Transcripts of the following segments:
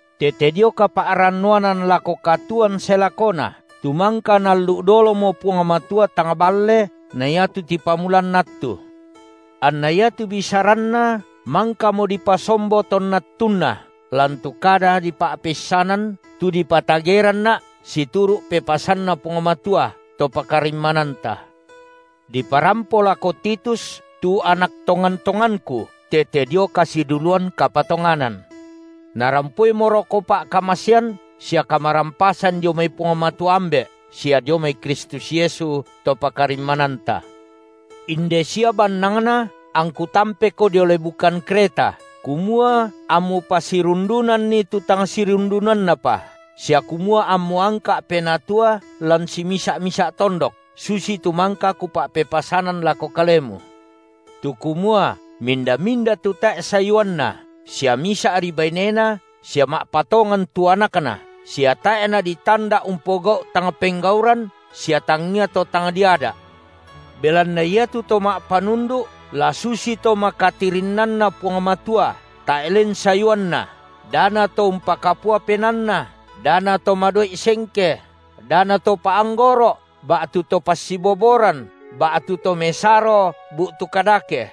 tete dio kapa’rannuanan lako katuoan sae lakona, tu mangka Naallu’ dolomo Puang Matua tang balle na iatu tipamulanna attu, anna iatu bisaranNa mangkamo dipasombo tonna attunna lan tu kada dipa’peissanan tu dipatageranna’ situru’ pepasanNa Puang Matua, To pakarimmananta. Diparampo lako Titus tu anak tongan-tonganku tete dio kasiduluan kapatonganan. Narampoimoroko pa’kamasean sia kamarampasan dio mai Puang Matua, Ambe’, sia dio mai Kristus Yesu, To pakarimmananta. Inde sia bannangna angku tampeko dio lebukan Kreta, kumua ammu pasirundunanni tu tang sirundunannapa, sia kumua ammu angka’ penatua lan simisa’-misa’ tondok, susitu mangka kupa’pepasanan lako kalemu, tu kumua minda-minda tu tae’ sayuanna, sia misa’ri bainena, sia ma’patongan tu anakna sia tae’ naditanda’ umpogau’ tang penggauran sia tangia to tang diada’. Belanna iatu to ma’panundu’ la susito makatirinnanNa Puang Matua tae’ len sayuanna, da nato umpakapua penaanna, da nato madoi’ sengke, da nato pa’anggoro’, ba’tu to passiboboran, ba’tu to mesaro bu’tu kadake;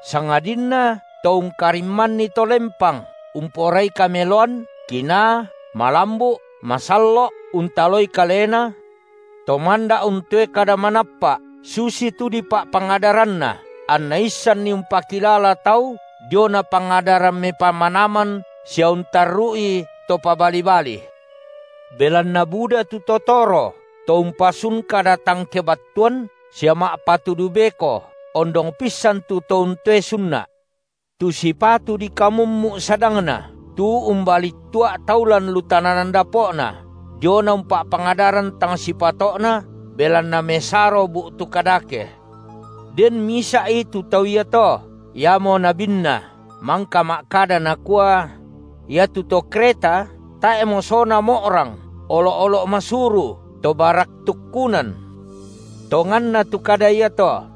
sangadinna to ungkarimmanni to lempang, umporai kameloan, kinaa, malambu’, masallo’, untaloi kalena, to manda’ untoe kada manappa’, susitu dipa’pangadaranna, anna issanni umpakilala tau diona pangadaran mepamanaman sia untarru’i to pabali-bali. Belanna buda tu to toro, to umpasun kada tang kebattuan, sia ma’patudu beko, ondong pissan tu to untoe sunna’. Tu sipatu dikamummu’ sadangna, tu umbalittua’ tau lan lu tananan dapo’na, diona umpa’pangadaran tang sipato’na, belanna mesaro bu’tu kadake. Den misa’i tu tau iato, iamo nabinna, mangka ma’kada nakua: Iatu to Kreta, tae’ mosona mo’rang, olo’-olo’ masuru, to barak tukkunan. Tonganna tu kada iato.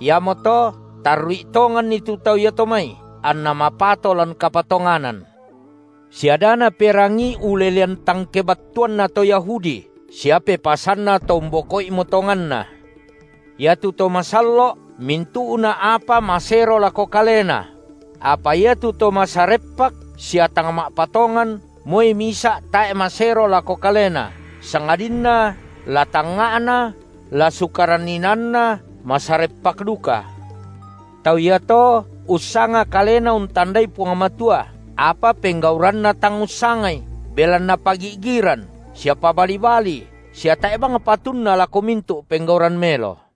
Iamoto, tarru’i tonganni tu tau iato mai, anna mapato lan kapatonganan, sia da naperangii ulelean tang kebattuanna to Yahudi sia pepasanna to umboko’imo tonganna. Iatu to masallo’, mintu’na apa masero lako kalena; apa iatu to masareppak sia tang ma’patongan, moi misa’ tae’ masero lako kalena, sangadinna la tangnga’na, la sukaran inaanna, masareppak duka. Tau iato ussanga kalena untandai Puang Matua, apa penggauranna tang ussangai, belanna pagi’giran, sia pabali-bali sia tae’ bang patunna lako mintu’ penggauran melo.